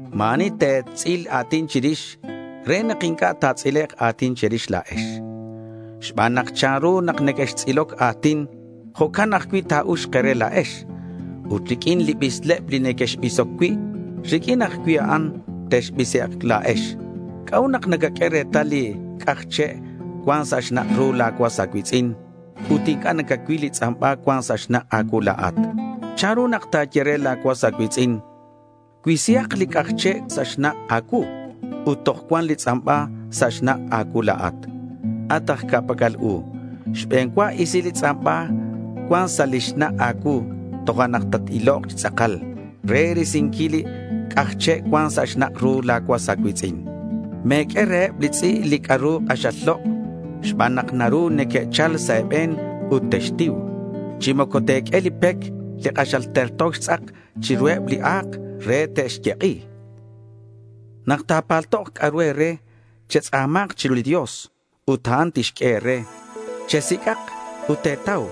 Ma̱ ani te̱tz'il a̱tin chirix re nak inc'a' ta̱tz'ilek' a̱tin che̱rix la̱ex. Xban nak chanru nak nequextz'iloc a̱tin, jo'can ajcui' ta̱uxk e̱re la̱ex. Ut riq'uin li bisleb li nequexbisoc cui', riq'uin ajcui' a'an texbisek' la̱ex. ¿C'a'ut nak nacaq'ue retal li c'aj che' cuan sa' xnak' ru la̱ cuas a̱cui̱tz'in ut inc'a' nacacuil li tz'amba cuan sa' xnak' a̱cuu la̱at? ¿Chanru nak ta̱ye re la̱ cuas a̱cui̱tz'in: “Cuisihak li c'aj che' sa' xnak' a̱cuu”, ut toj cuan li tz'amba sa' xnak' a̱cuu la̱at? At aj ca'pac'al u, xbe̱n cua isi li tz'amba cuan sa' li xnak' a̱cuu, tojo'nak tat-ilok chi tz'akal re risinquil li c'aj che' cuan sa' xnak' ru la̱ cuas a̱cui̱tz'in. Me̱q'ue reheb li tz'i' li c'a'ru k'axal lok' xban nak naru neque'chal sa' e̱be̱n ut textiu. Chi moco te̱q'ue li pec li k'axal terto xtz'ak chiruheb li a̱k re te'xyek'i. Nak ta̱paltok c'a'ru e̱re, chextz'a̱ma̱nk chiru li Dios ut a'an tixq'ue e̱re; chesic'ak ut te̱tau,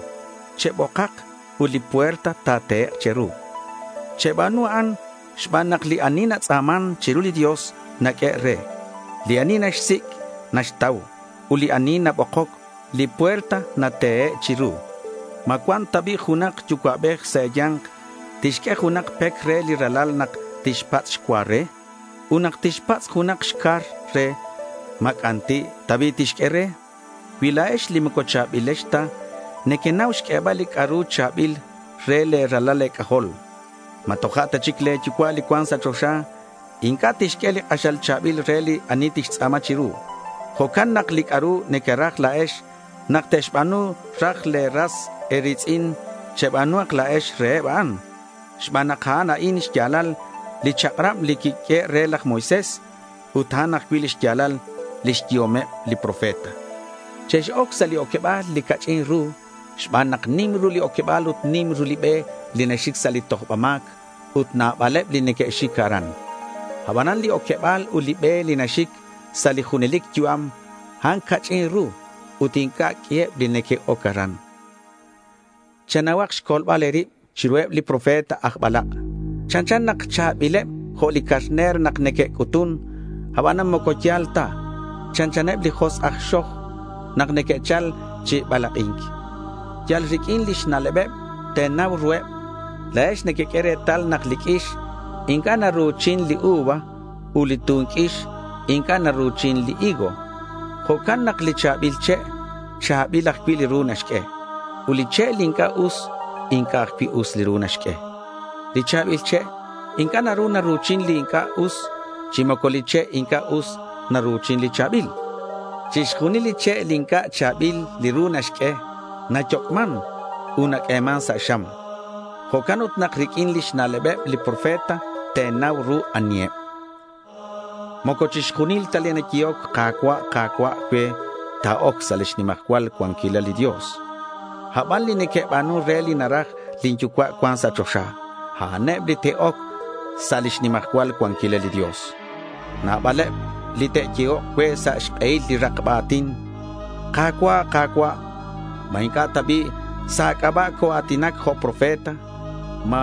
chebokak ut li puerta ta̱tehek' che̱ru. Cheba̱nu a'an xban nak li ani natz'a̱man chiru li Dios naq'uehe' re. Li ani naxsic', naxtau. Ut li ani nabokoc, li puerta natehe' chiru. ¿Ma cuan ta bi' junak yucua'bej sa' e̱ya̱nk tixq'ue junak pec re li ralal nak tixpatz' xcua re? Ut nak tixpatz' junak xcar re, ¿ma c'anti' ta bi' tixq'ue re? Cui la̱ex li moco cha̱bilex ta nequenau xq'uebal li c'a'ru cha̱bil re le̱ ralal e̱c'ajol, ¿ma toja' ta chic le̱ Yucua' li cuan sa' choxa inc'a' tixq'ue li k'axal cha̱bil re li ani tixtz'a̱ma chiru? Jo'can nak li c'a'ru nequeraj la̱ex nak te'xba̱nu raj le̱ ras e̱ri̱tz'in, cheba̱nuhak la̱ex reheb a'an, xban nak a'an a'in xya̱lal li chak'rab li quiq'uehe' re laj Moisés, ut a'an ajcui' li xya̱lal lix yehomeb li profeta. Chex-oc sa' li oqueba̱l li ca'ch'in ru xban nak nim ru li oqueba̱l ut nim ru li be li naxic sa' li tojba ma̱c ut nabaleb li neque'xic aran. Abanan li oqueba̱l ut li be li naxic sa' li junelic yu'am, a'an ca'ch'in ru ut inc'a' q'uiheb li neque'oc aran. Chenauhak xcolbal e̱rib chiruheb li profeta aj balak'. Chanchan nak cha̱bileb jo' li carner nak neque'c'utun. Abanan moco ya̱l ta. Chanchaneb li josk' aj xoj nak neque'chal chi balak'i̱nc. Yal riq'uin lix na'lebeb te̱nau ruheb. La̱ex nequeq'ue retal nak li q'uix inc'a' naru̱chin li uva ut li tun q'uix inc'a' naru̱chin li higo. Jo'can nak li cha̱bil che', cha̱bil ajcui' li ru naxq'ue. Ut li che' li inc'a' us, inc'a' ajcui' us li ru naxq'ue. Li cha̱bil che' inc'a' naru naru̱chin li inc'a' us, chi moco li che' inc'a' us naru̱chin li cha̱bil. Chixjunil li che' li inc'a' cha̱bil li ru naxq'ue nayoc'man ut naq'ueman sa' xam. Jo'can ut nak riq'uin lix na'lebeb li profeta te̱nau ru aniheb. Moco chixjunileb ta li neque'yehoc “Ka̱cua', Ka̱cua'” cue, te'oc sa' lix nimajcual cuanquilal li Dios. Aban li neque'ba̱nun re li naraj lin Yucua' cuan sa' choxa, a'aneb li te'oc sa' lix nimajcual cuanquilal li Dios. Nabaleb li te'yehok cue sa' xk'ehil li rakba a̱tin, “Ka̱cua', Ka̱cua', ¿ma ma̱cua' ta bi' sa' a̱c'aba' coa̱tinac jo' profeta? ¿Ma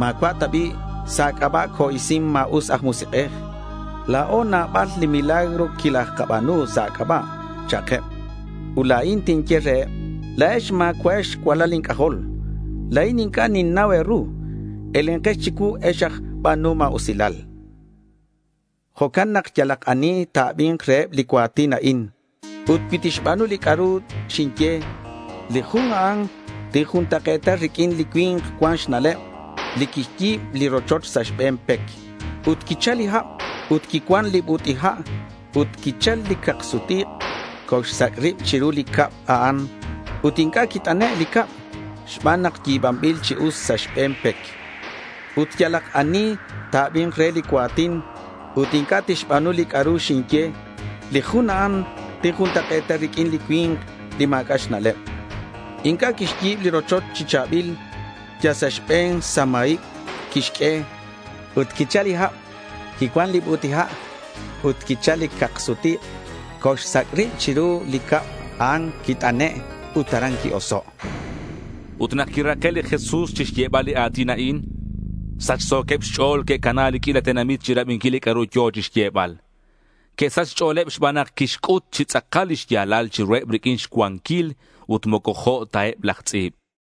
ma̱cua' ta bi' sa' a̱c'aba' co-isin ma̱us aj musik'ej? La̱o nabal li milagro quilajkaba̱nu sa' a̱c'aba'”, cha'keb. Ut la̱in tinye reheb, “La̱ex ma̱cua'ex cualal inc'ajol. La̱in inc'a' ninnau e̱ru. Elenkex chicuu, ex aj ba̱nuhom ma̱usilal.” Jo'can nak yalak ani ta̱abi̱nk reheb li cua̱tin a'in ut cui tixba̱nu li c'a'ru xinye, li jun a'an tinjuntak'e̱ta riq'uin li cui̱nk cuan xna'leb li quixyi̱b li rochoch sa' xbe̱n pec. Ut quichal li hab ut quicuan li but'i ha', ut quichal li cak-sut-ik'. Coxsac' rib chiru li cab a'an, ut inc'a' quit'ane' li cab xban nak yi̱banbil chi us sa' xbe̱n pec. Ut yalak ani ta̱abi̱nk re li cua̱tin ut inc'a' tixba̱nu li c'a'ru xinye, li jun a'an tinjuntak'e̱ta riq'uin li cui̱nk li ma̱c'a' xna'leb. Inc'a' quixyi̱b li rochoch chi cha̱bil. Yal sa' xbe̱n samaib quixq'ue. Ut quichal li hab, quicuan li but'i ha' ut quichal li cak-sut-ik'. Coxsac' rib chiru ut li cab a'an quit'ane' ut aran qui-oso'. Ut nak quirake' li Jesús chixyebal li a̱tin a'in, sachso̱queb xch'o̱l que'cana li q'uila tenamit chirabinquil li c'a'ru yo̱ chixyebal. Que'sach xch'o̱leb xban nak quixc'ut chi tz'akal li xya̱lal chiruheb riq'uin xcuanquil ut moco jo' ta eb laj tz'i̱b.